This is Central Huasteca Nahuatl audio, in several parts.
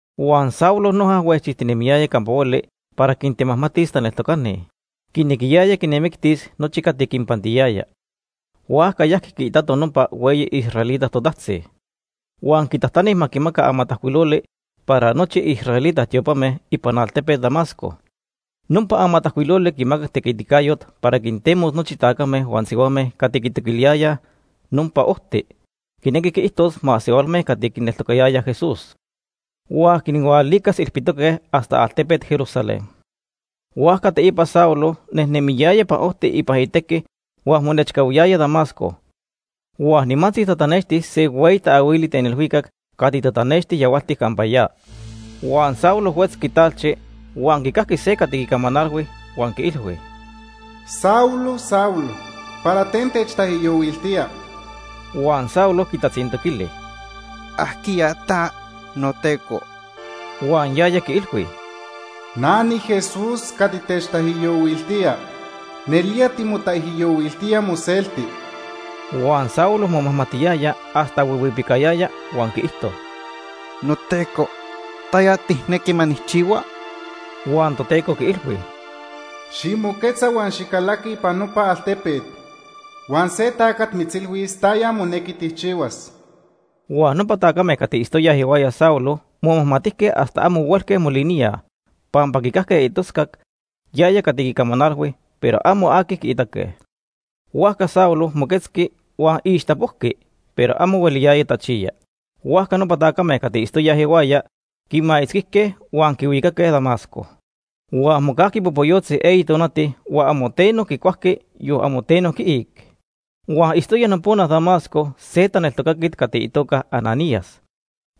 Huan Saulo noja huejchijtinemiyaya campa hueli para quintemajmatis taneltocani. Quinequiyaya quinmictis nochi cati quinpantiyaya. Huajca yajqui quiitato nopa hueyi israelita totajtzi. Huan quitajtani ma quimaca amatajcuiloli para nochi israelita tiopame ipan altepet Damasco. Nopa amatajcuiloli quimacac tequiticayot para quintemos nochi tacame huan sihuame cati quitoquiliyayaj “Nopa Ojti”, quinequi quiijtos masehualme cati quineltocayayaj Jesús, huan quinhualicas ilpitoque hasta altepet Jerusalén. Huajca teipa Saulo nejnemiyaya ipan ojti ipan itequi huan monechcahuiyaya Damasco, huan nimantzi tatanexti se hueyi taahuili ten ilhuicac cati tatanexti yahualtic campa ya. Huan Saulo huetzqui talchi huan quicajqui se cati quicamanalhui huan quiilhui: “Saulo, Saulo, ¿para ten techtaijyohuiltía?” Huan Saulo quitatzintoquili: “¿Ajquiya ta, noTeco?” Huan yaya quiilhui: “Na niJesús cati techtaijyohuiltía. Nelía timotaijyohuiltía moselti.” Huan Saulo momajmatiyaya hasta huihuipicayaya huan quiijto: “NoTeco, ¿taya tijnequi ma nijchihua?” Huan Toteco quiilhui: “Ximoquetza huan xicalaqui ipan nopa altepet. Huan se tacat mitzilhuis taya monequi tijchihuas.” Huan nopa tacame cati itztoyaj ihuaya Saulo momajmatijque hasta amo huelque moliníaj, pampa quicajque itoscac yaya cati quicamanalhui, pero amo aqui quiitaque. Huajca Saulo moquetzqui, huan ixtapojqui, pero amo hueliyaya tachiya. Huajca nopa tacame cati itztoyaj ihuaya quimaitzquijque huan quihuicaque Damasco. Huan mocajqui popoyotzi eyi tonati huan amo teno quicuajqui, yon amo teno quiic. Huan itztoya nopona Damasco se taneltocaquet cati itoca Ananías.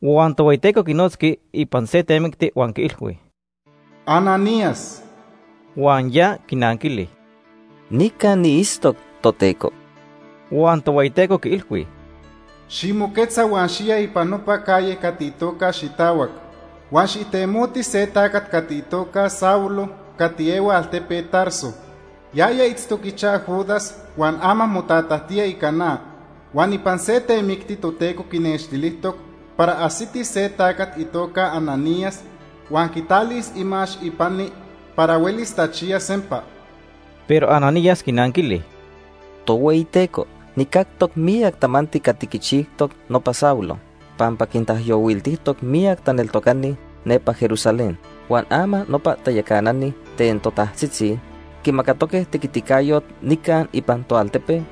Huan Tohueyiteco quinotzqui ipan se temicti huan quiilhui: “Ananías.” Huan ya quinanquili: “Nica niitztoc, Toteco.” Huan Tohueyiteco quiilhui: “Ximoquetza huan xiya ipan nopa calle cati itoca ‘Xitahuac’. Huan xijtemoti se tacat cati itoca Saulo cati ehua altepet Tarso. Yaya itztoc ichaj Judas huan ama motatajtía ica na. Huan ipan se temicti Toteco quinextilijtoc para ajsiti se tacat itoca Ananías huan quitalis imax ipani para huelis tachiyas sempa.” Pero Ananías quinanquili: ―Tohueyiteco, nijcactoc miyac tamanti cati quichijtoc nopa Saulo, pampa quintaijyohuiltijtoc miyac taneltocani nepa Jerusalén. Huan ama nopa tayacanani ten totajtzitzi quimacatoque tequiticayot nica ipan toaltepe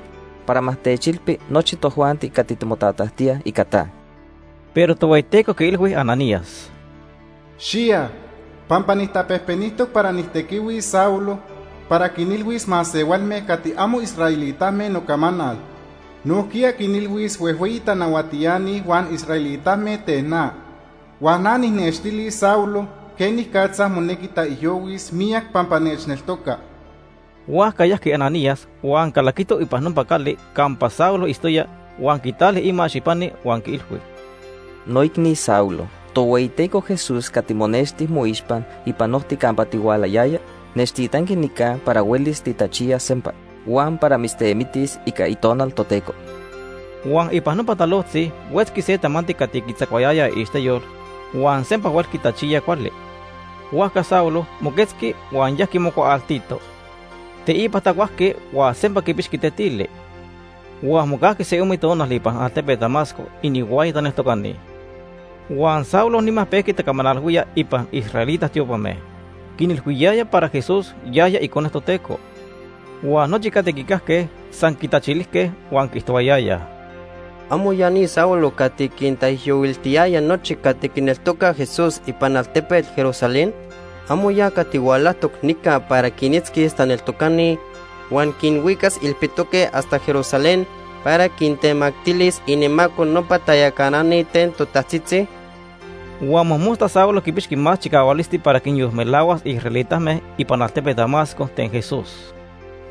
para ma techilpi nochi tojuanti cati timotatajtíaj ica ta. Pero Tohueyiteco quiilhui Ananías: ―Xiya, pampa nijtapejpenijtoc para nijtequihuis Saulo para quinilhuis masehualme cati amo israelitame nocamanal. Nojquiya quinilhuis huejhueyi tanahuatiani huan israelitame ten na. Huan na nijnextilis Saulo quenicatza monequi taijyohuis miyac pampa nechneltoca Por notoca.. Huajca yajqui Ananías huan calaquito ipan nopa cali campa Saulo itztoya, huan quitali imax ipani huan quiilhui: ―Noicni Saulo, Tohueyiteco Jesús cati monexti moixpa ipan ojti campa tihualayaya, nechtitanqui nica para huelis titachiyas sempa huan para mitztemitis ica Itonal Toteco. Huan ipan nopa talojtzi huetzqui se tamanti cati quitzacuayaya iixteyol, huan sempa huelqui tachiya cuali. Huajca Saulo moquetzqui huan yajqui mocuaaltito. Teipa tacuajqui huan sempa quipixqui tetili. Huan mocajqui se ome tonal ipan altepet Damasco inihuaya taneltocani. Huan Saulo nima pejqui tacamanalhuía ipan israelita tiopame. Quinilhuiyaya para Jesús yaya Icone Toteco. Huan nochi cati quicajque san quitachilijque huan quiijtohuayayaj: ―¿Amo ya ni Saulo cati quintaijyohuiltiyaya nochi cati quineltocaj Jesús ipan altepet Jerusalén? ¿Amo ya cati hualajtoc nica para quinitzquis taneltocani huan quinhuicas ilpitoque hasta Jerusalén para quintemactilis inimaco nopa tayacanani ten totajtzitzi? Huan mojmosta Saulo quipixqui más chicahualisti para quinyolmelahuas israelitame ipan altepet Damasco ten Jesús.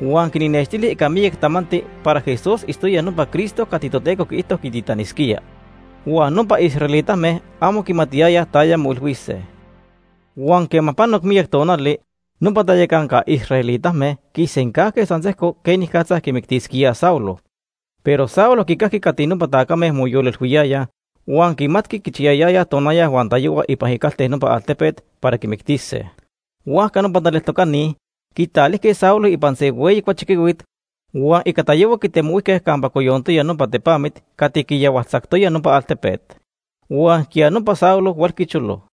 Huan quinnextili ica miyac tamanti para Jesús itztoya nopa Cristo cati Toteco quiijto quititanisquía. Huan nopa israelitame amo quimatiyayaj taya moilhuise. Huan quema panoc miyac tonali, nopa tayacanca israelitame quisencajque san sejco quenicatza quimictisquíaj Saulo. Pero Saulo quicajqui cati nopa tacame moyolilhuiyayaj huan quimatqui quichiyayayaj tonaya huan tayohua ipan icalte nopa altepet para quimictise. Huajca nopa taneltocani quitalijque Saulo ipan se hueyi cuachiquihuit huan ica tayohua quitemohuijque campa coyontoya nopa tepamit cati quiyahualtzajqui nopa altepet. Huan ijquiya nopa Saulo huelqui cholo.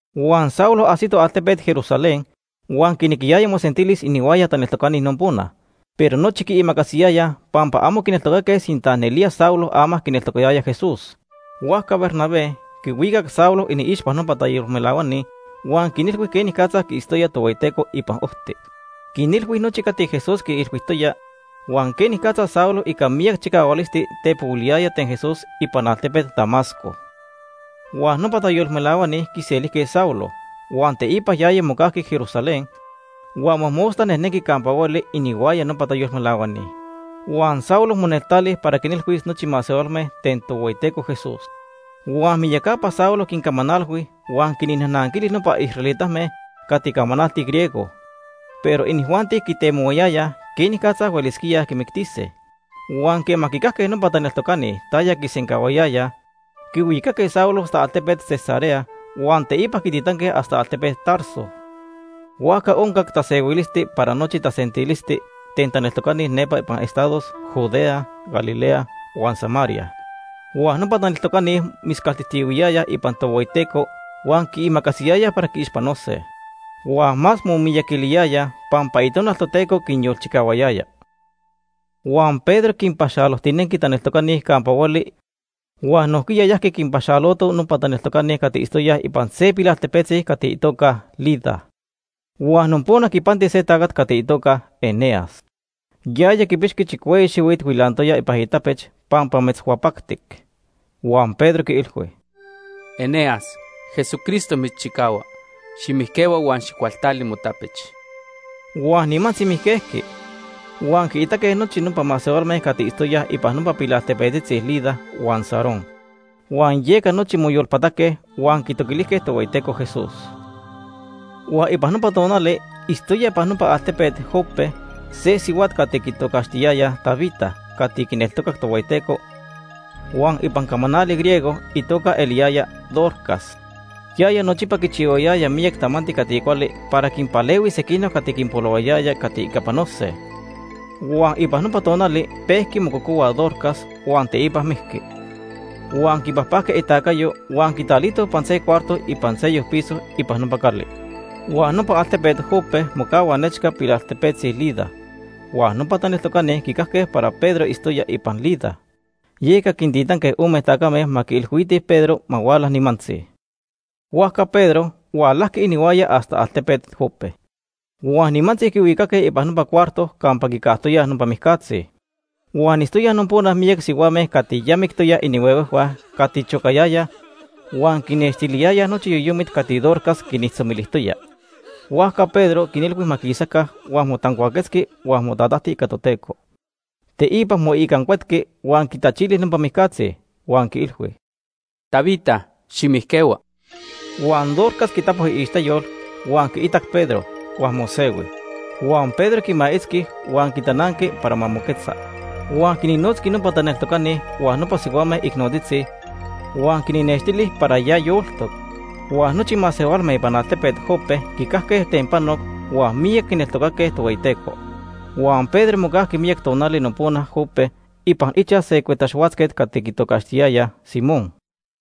Huan Saulo ajsito altepet Jerusalén huan quinequiyaya mosentilis inihuaya taneltocani nopona, pero nochi quiimacasiyayaj pampa amo quineltocaque sinta nelía Saulo ama quineltocatoya Jesús. Huajca Bernabé quihuicac Saulo iniixpa nopa tayolmelahuani huan quinilhui quenicatza quiitztoya Tohueyiteco ipan ojti. Quinilhui nochi cati Jesús quiilhuijtoya huan quenicatza Saulo ica miyac chicahualisti tepohuiliyaya ten Jesús ipan altepet Damasco. Huan nopa tayolmelahuani quiselijque Saulo, huan teipa yaya mocajqui Jerusalén huan mojmosta nejnenqui campa hueli inihuaya nopa tayolmelahuani. Huan Saulo moneltali para quinilhuis nochi masehualme ten Tohueyiteco Jesús. Huan miyacapa Saulo quincamanalhui huan quinnajnanquili nopa israelitame cati camanaltij griego; pero inijuanti quitemohuayayaj quenicatza huelisquía quimictise. Huan quema quicajque nopa taneltocani taya quisencahuayayaj, quihuicaque Saulo hasta altepet Cesarea huan teipa quititanque hasta altepet Tarso. Huajca oncac tasehuilisti para nochi tasentilisti ten taneltocani nepa ipan estados Judea, Galilea, huan Samaria. Huan nopa taneltocani moscaltijtiyahuiyayaj ipan Tohueyiteco huan quiimacasiyayaj para quiixpanose. Huan más momiyaquiliyayaj pampa Itonal Toteco quinyolchicahuayaya. Huan Pedro quinpaxalojtinenqui taneltocani campa hueli huan nojquiya yajqui quinpaxaloto nopa taneltocani cati itztoyaj ipan se pilaltepetzi cati itoca Lida. Huan nopona quipanti se tacat cati itoca Eneas. Yaya quipixqui chicueyi xihuit huilantoya ipan itapech pampa metzhuapactic. Huan Pedro quiilhui: ―Eneas, Jesucristo mitzchicahua. Ximijquehua huan xijcualtali motapech. Huan nimantzi mijquejqui, huan quiitaque nochi nopa masehualme cati itztoyaj ipan nopa pilaltepetzitzi Lida huan Sarón. Huan yeca nochi moyolpataque huan quitoquilijque Tohueyiteco Jesús. Huan ipan nopa tonali itztoya ipan altepet Jope se sihuat cati quitocaxtiyayaj Tabita cati quineltocac Tohueyiteco huan ipan camanali griego itoca eliyaya Dorcas. Yaya nochipa quichihuayaya miyac tamanti cati cuali para quinpalehuis sequinoc cati quinpolohuayaya cati ica panose. Huan ipan nopa tonali pejqui mococohua Dorcas huan teipa mijqui. Huan quipajpajque itacayo huan quitalitoj ipan se cuarto ipan seyoc piso ipan nopa cali. Huan nopa altepet Jope mocahua nechca pilaltepetzi Lida, huan nopa taneltocani quicajque para Pedro itztoya ipan Lida. Yeca quintitanque ome tacame ma quiilhuitij Pedro ma huala nimantzi. Huajca Pedro hualajqui inihuaya hasta altepet Jope. Huan nimantzi quihuicaque ipan nopa cuarto campa quicajtoyaj nopa mijcatzi. Huan itztoyaj nopona miyac sihuame cati mijque inihuehue cati chocayayaj huan quinextiliyayaj nochi yoyomit cati Dorcas quinijtzomilijtoya. Huajca Pedro quinilhui ma quisaca, huan motancuaquetzqui huan motatajti ica Toteco. Teipa moicancuetqui huan quitachili nopa mijcatzi huan quiilhui: ―Tabita, ximijquehua. Huan Dorcas quitapo iixteyol, huan quiitac Pedro huan mosehui. Huan Pedro quimaitzqui huan quitananqui para ma moquetza. Huan quinnotzqui nopa taneltocani huan nopa sihuame icnotzitzi, huan quinnextili para ya yoltoc. Huan nochi masehualme ipan altepet Jope quicajque ten panoc huan miyac quineltocaque Tohueyiteco. Huan Pedro mocajqui miyac tonali nopona Jope ipan ichaj se cuetaxhuatzquet cati quitocaxtiyaya Simón.